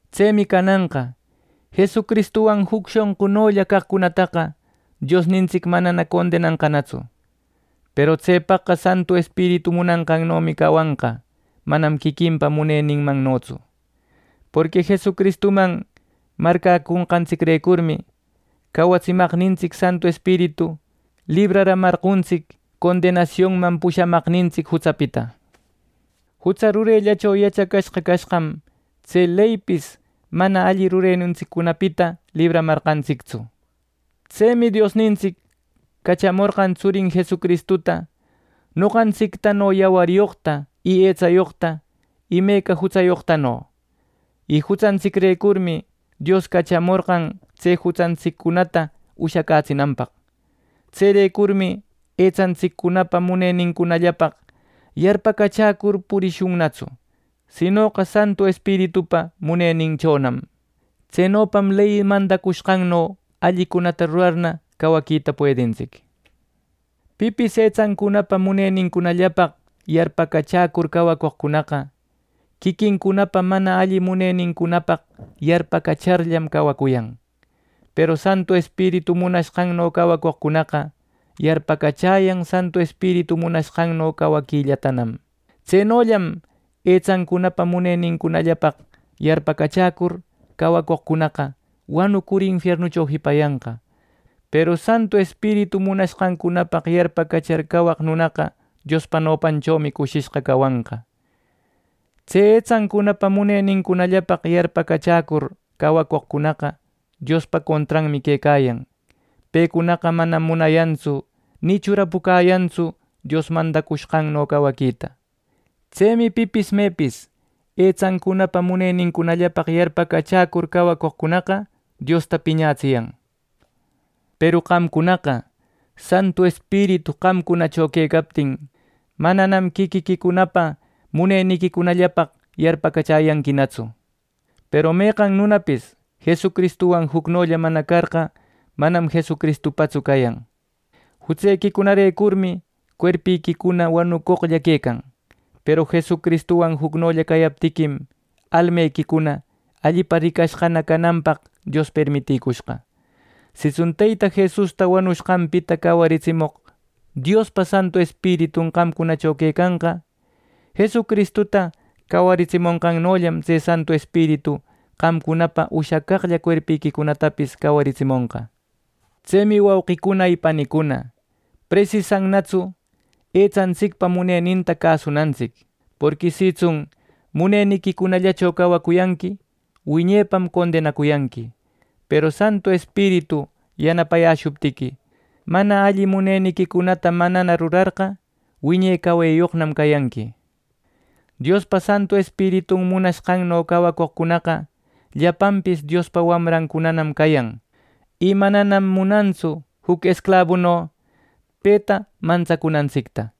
Tsemi cananqa Jesucristuwan juc shonqulla caqcunataqa Diosnintsic manana condenanqanatsu; ˻peru tsepaqqa Santu Espiritu munanqannomi cawanqa, manam quiquinpa muneninmannotsu.˼ Porqui Jesucristuman marcäconqantsicrecurmi cawatsimaqnintsic Santu Espiritu libraramarqontisic condenasionman pushamaqnintsic jutsapita. Jutsa rurellacho yachacashqa cashqam tse leypis mana alli rurenintsiccunapita libramarqantsictsu. Tsemi Diosnintsic cachamorqan tsurin Jesucristuta noqantsictano yawaryoqta y etsayoqta imeca jutsayoqtano. Y jutsantsicrecurmi, Dios cachamorqan tse jutsantsiccunata ushacätsinanpaq. Tserecurmi etsantsiccunapa munenincunallapaq yarpacachäcur purishunnatsu, sinoqa Santu Espiritupa muneninchonam. Tsenopam ley mandacushqanno allicunata rurarna cawaquita puedintsic. Pipis etsancunapa munenincunallapaq yarpacachäcur cawacoqcunaqa, quiquincunapa mana alli munenincunapaq yarpacacharllam cawacuyan; peru Santu Espiritu munashqanno cawacoqcunaqa yarpacachäyan Santu Espiritu munashqanno cawaquillatanam. Tsenollam etsancunapa munenincunallapaq yarpacachäcur cawacoqcunaqa wanucur infiernucho jipanqa; peru Santu Espiritu munashqancunapaq yarpacachar cawaq nunaqa Diospa nopanchomi cushishqa cawanqa. Tse etsancunapa munenincunallapaq yarpacachäcur cawacoqcunaqa Diospa contranmi quecayan. Pecunaqa manam munayantsu ni churapucäyantsu Dios mandacushqanno cawaquita. Tsemi pipis mepis etsancunapa munenincunallapaq yarpacachäcur cawacoqcunaqa Diosta piñatsiyan. Peru qamcunaqa, Santu Espiritu qamcunacho quecaptin, mananam quiquiquicunapa muneniquicunallapaq yarpacachäyanquinatsu. Peru meqan nunapis Jesucristuwan jucnolla mana carqa, manam Jesucristupatsu cayan. Jutsequicunarecurmi cuerpiquicuna wanucoqlla quecan. Peru Jesucristuwan jucnolla cayaptiquim, almequicuna allipa ricashqa cananpaq Dios permiticushqa. Sitsun Teyta Jesusta wanushqanpita cawaritsimoq Diospa Santu Espiritun qamcunacho quecanqa; Jesucristuta cawaritsimonqannollam tse Santu Espiritu qamcunapa ushacaqlla cuerpiquicunatapis cawaritsimonqa. Tsemi wauqicuna y panicuna, presisannatsu etsantsicpa muneninta cäsunantsic. Porqui sitsun muneniquicunallacho cawacuyanqui wiñepam condenacuyanqui; peru Santu Espiritu yanapayäshuptiqui, mana alli muneniquicunata manana rurarqa, wiñe cawayoqnam cayanqui. Diospa Santu Espiritun munashqanno cawacoqcunaqa llapanpis Diospa wamrancunanam cayan. Y mananam munantsu juc esclabuno peta mantsacunantsicta.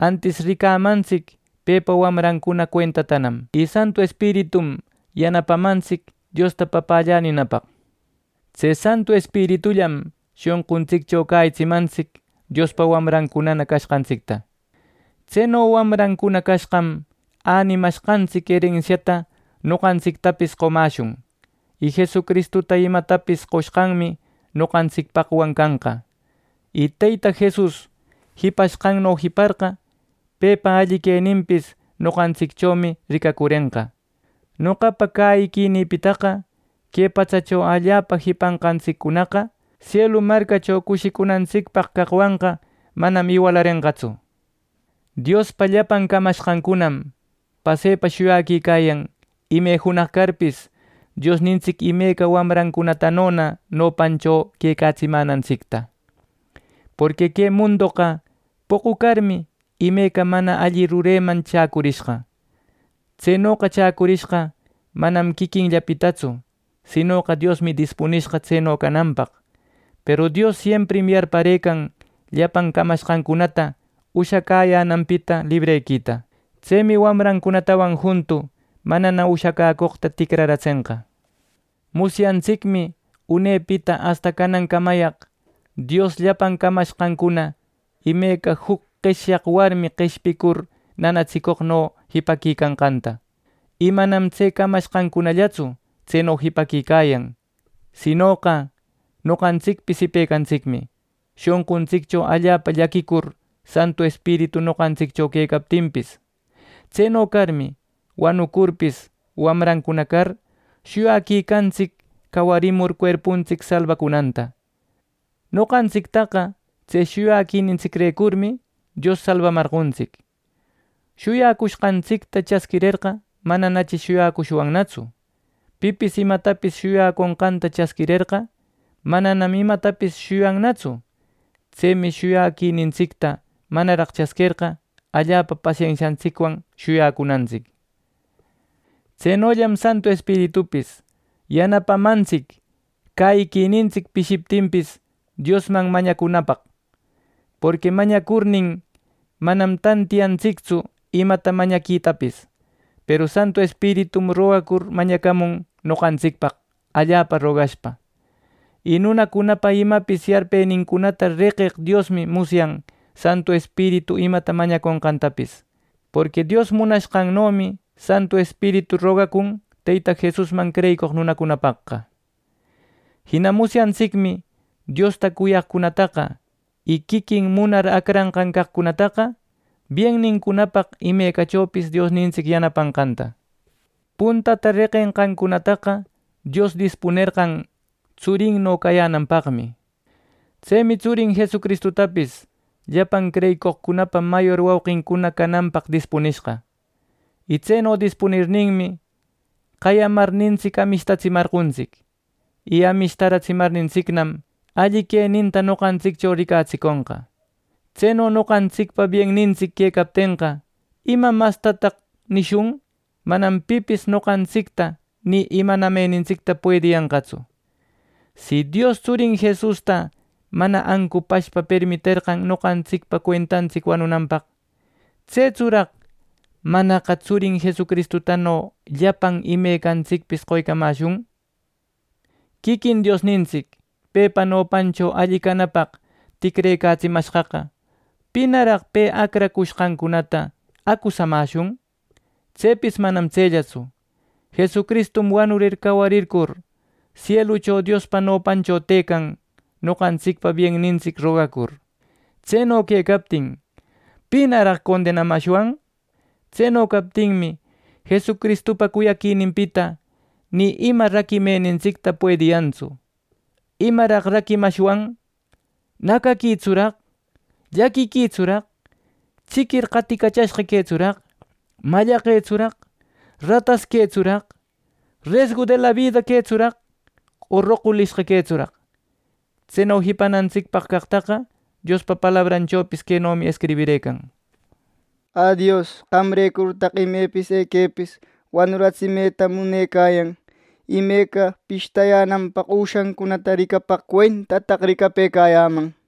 Antis ricamantsic pepa wamran cuentatanam. Y Santu Espiritum yanapamantsic Diosta “Papällä” ninapaq. Tse Santu Espiritullam shonquntsiccho cäyitsimantsic Diospa wamrancunana cashqantsicta. Tseno wamrancuna cashqam, änimashqantsic erensiata noqantsictapis qomäshun, y Jesucristuta imatapis qoshqanmi noqantsicpaqwan canqa. Y Teyta Jesus jipashqanno jiparqa, pepa alli queninpis noqantsicchomi ricacurenqa. Noqapa cäyiquinïpitaqa: Que patsacho allapa jipanqantsiccunaqa, sielu marcacho cushicunantsicpaq caqcunawanqa manam iwalarenqatsu. Diospa llapan camashqancunam pasepa shuyaquicayan ime junaq carpis, Diosnintsic imeca wamrancunatanona nopancho quecatsimänantsicta. Porqui que mundoqa poqu carmi, imeca mana alli rureman chäcurishqa. Tsenoqa chäcurishqa manam quiquinllapitatsu, sinoqa Diosmi dispunishqa tseno cananpaq. Peru Dios siemprim yarparëcarqan llapan camashqancunata ushacäyänanpita librequita. Tsemi wamrancunatawan juntu mana ushacäcoqta ticraratsenqa. Musyantsicmi unepita asta canancamayaq Dios llapan camashqancuna imeca juc qeshyaq warmi qeshpicur nanatsiconqanno jipaquicayanqanta. Y manam tse camashqancunallatsu tseno jipaquicayan; sinoqa noqantsicpis jipecantsicmi shonquntsiccho allapa llaquicur, Santu Espiritu noqantsiccho quecaptinpis. Tseno carmi, wanucurpis, wamrancuna car, shuyaquicantsic cawarimur cuerpuntsic salbacunanta. Noqantsictaqa tse shuyaquinintsicrecurmi Dios salbamarqontsic. Shuyacushqantsicta chasquirerqa mananachi shuyacushwannatsu. Pipis imatapis shuyacushqanta chasquirerqa, mananam imatapis shuyannatsu. Tsemi shuyacushqantsicta manaraq chasquerqa, allapa pasensiantsicwan shuyacunantsic. Tsenollam Santu Espiritupis yanapamantsic, cäyiquinintsic pishiptinpis Diosman mañacunapaq. Porqui mañacurnin manam tantiyantsictsu imata mañaquitapis; peru Santu Espiritum rogacur mañacamun noqantsicpaq, allapa rogashpa. Y nunacunapa imapis yarpenincunata reqeq Diosmi musyan Santu Espiritu imata mañaconqantapis; porqui Dios munanqanmannomi Santu Espiritu rogacun, Teyta Jesusman creyicoq nunacunapaqqa. Jina musyantsicmi Diosta cuyaqcunataqa, y quiquin munar acranqan caqcunataqa biennincunapaq imecachopis Diosnintsic yanapanqanta. Puntata reqenqancunataqa Dios dispunerqan tsurinno cayänanpaqmi. Tsemi tsurin Jesucristutapis llapan creyicoqcunapa mayor wauqincunana cananpaq dispunishqa. Y tseno dispunirninmi qayamarnintsic, amishtamarqontsic. Y amishtaramarnintsicnam, alli queninta noqantsiccho ricatsiconqa. Tseno noqantsicpa biennintsic quecaptenqa, ¿ima mastanataq nishun! Manam pipis noqantsicta ni imanamenintsicta puediyanqatsu. Si, Dios tsurin Jesusta mana ancupashpa permiterqan noqantsicpa cuentantsic wanunanpaq. ¿Tsetsuraq manaqa tsurin Jesustano llapan imecantsicpis qoycamäshun! Quiquin Diosnintsic pepa nopancho alli canapaq ticrecatsimashqaqa ¿pinaraq pe acrashqancunata acusamäshun! ¡Tsepis manam tsellatsu! Jesucristum wanurir, cawarircur, sielucho Diospa nopancho tëcan noqantsicpa biennintsic rogacur, ¡Tseno quecaptin! ¿Pinaraq condenamashwan! Tseno captinmi, Jesucristupa cuyaquininpita ni ima raquimenintsicta puediyantsu. ¿Imaraq raquiramashwan! ¿Nacaquitsuraq, llaquiquitsuraq, chiquir qaticachashqa quetsuraq, mallaqetsuraq, ratas quetsuraq, resgu de la bida quetsuraq, o roqulishqa quetsuraq! Tseno jipanantsicpaq caqtaqa Diospa palabranchopis quenomi escribirëcan: “¡Ä Dios, qamrecurtaq imepis, equepis, wanuratsimeta munecayan! ¡Imeca pishtayänanpaq üshancunata ricapaq cuentataq, ricapëcayäman!” nir.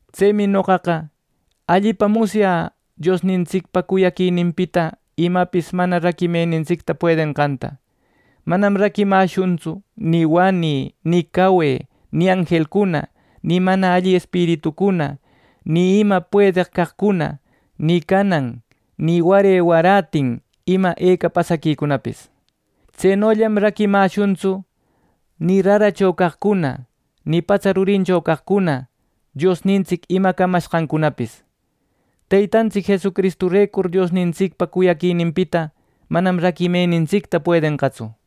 Tsemi noqaqa allipa musyä Diosnintsicpa cuyaquininpita imapis mana raquimenintsicta puedenqanta. Manam raquimäshuntsu ni wanï, ni cawe, ni anjelcuna, ni mana alli espiritucuna, ni ima puedeq caqcuna, ni canan ni ware warätin ima eca pasaquicunapis. ¡Tsenollam raquimashuntsu ni raracho caqcuna, ni patsa rurincho caqcuna, Diosnintsic ima camashqancunapis, Teytantsic Jesucristurecur Diosnintsicpa cuyaquininpita manam raquimenintsicta puedenqatsu!